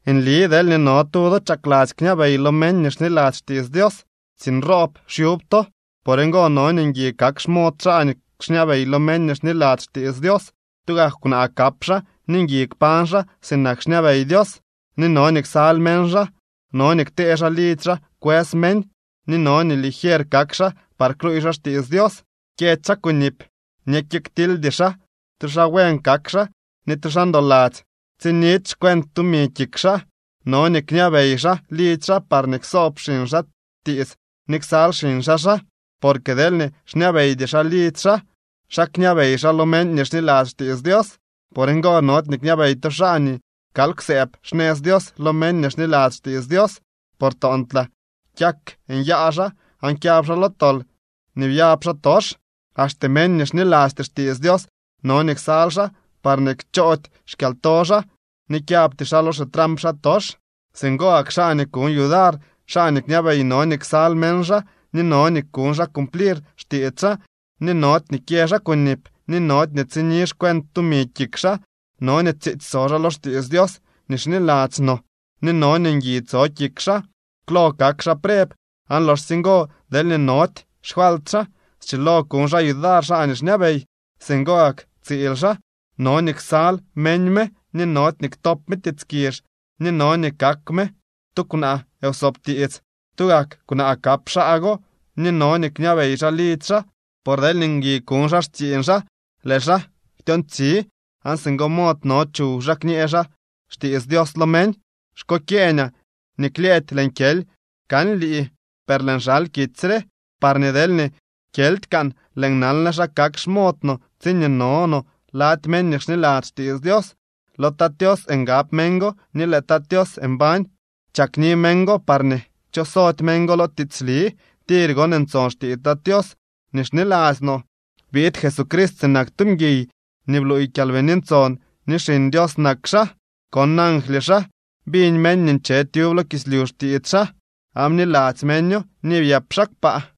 Nli deelñee no tu do chakladzy kñabey lo meñ nii xniladzy xtiits Dios, tsiiñ roob xyub to. Por ngo no nii ngui kak xmod xaa nii xñabey lo meñ nii xniladzy xtiits Dios. Tugak kwnaa kap xaa ni ngui kpañ xaa sinak xñabey Dios ni no nii ksal meñ xaa. No nii ktee xaa lidzy xaa kwës meñ. Ni no nii ligier kak xaa par kluuy xaa xtiits Dios. Kyëdy xaa kunip ni kyëktildy xaa, tu xaa buen kak xaa ni tu xaa ndoladzy, tsinidy xcuent tumi kik xaa. No nii kñabey xaa lidzy xaa parñee ksoob xiñ xaa tiits ni ksal xiñ xaa xaa. Porque deelñee xñabeydy xaa lidzy xaa, ¿xa kñabey xaa lo meñ nii xniladzy xtiits Dios? Por ngo nody nii kñabey tu xaa nii kal kwsëëb xnëz Dios lo meñ nii xniladzy xtiits Dios. Por toontlaa kyak nyaa xaa aan kyab xaa lo tol nii byab xaatox. Axte meñ nii xnilasty xtiits Dios no nii ksal xaa parñee kchoody xkyalto xaa ni kyabty xaa lo xitramp xaatox. Singo gak xaa nii kuñ yudar xaa nii xñabey no nii ksal meñ xaa ni no nii kuñ xaa cumplir xtiits xaa, ni nody nii kyë xaa kunip, ni nody ni tsini xcuent tumi kik xaa. No nii tsiitsy so xaa lo xtiits Dios nii xniladzy no, ni no nii ngui tso kik xaa. Klo kak xaa preb, aan loxsye ngo, deelñee nody xfalt xaa, schilo kuñ xaa yudar xaa nii xñabey. Singo gak tsiil xaa, no nii ksal meñ me ni nody nii ktop me tiits kizh, ni no nii kak me tu kwnaa wsoob tiits. Tugak kwnaa kap xaa go, ni no nii kñabey xaa lidzy xaa. Por deelñee ngui kuñ xaa xtsiiñ xaa, lëë xaa ktyoontsi, aan singo mod no chuw xaa kñee xaa xtiits Dios lo meñ. Xkokyeeñaa nii klyëëdy lëën kyely kan lii. Per lëën xal kitsy re parñee, deelñee kyeldy kan lëël nanle xa kak xmod no tsiñee no no lady meñ ni xniladzy xtiits Dios. Lo Tat Tios ngab meñ go, ni lëë Tat Tios mbañ chakni meñ go parñee kchosody meñ go lo tiitsli. Tir gon ntson xtiits Tat Tios nii xniladzy no: Biid Jesucrist sinak tu mguiy, ni bluuy Kyalbini Ntson nii Xiñ Dios nak xaa. Kon angly xaa. Biñ meñ nii nche tyub lo kislyu xtiits xaa, aan bniladzy meño, ni byëp xaa kpaa.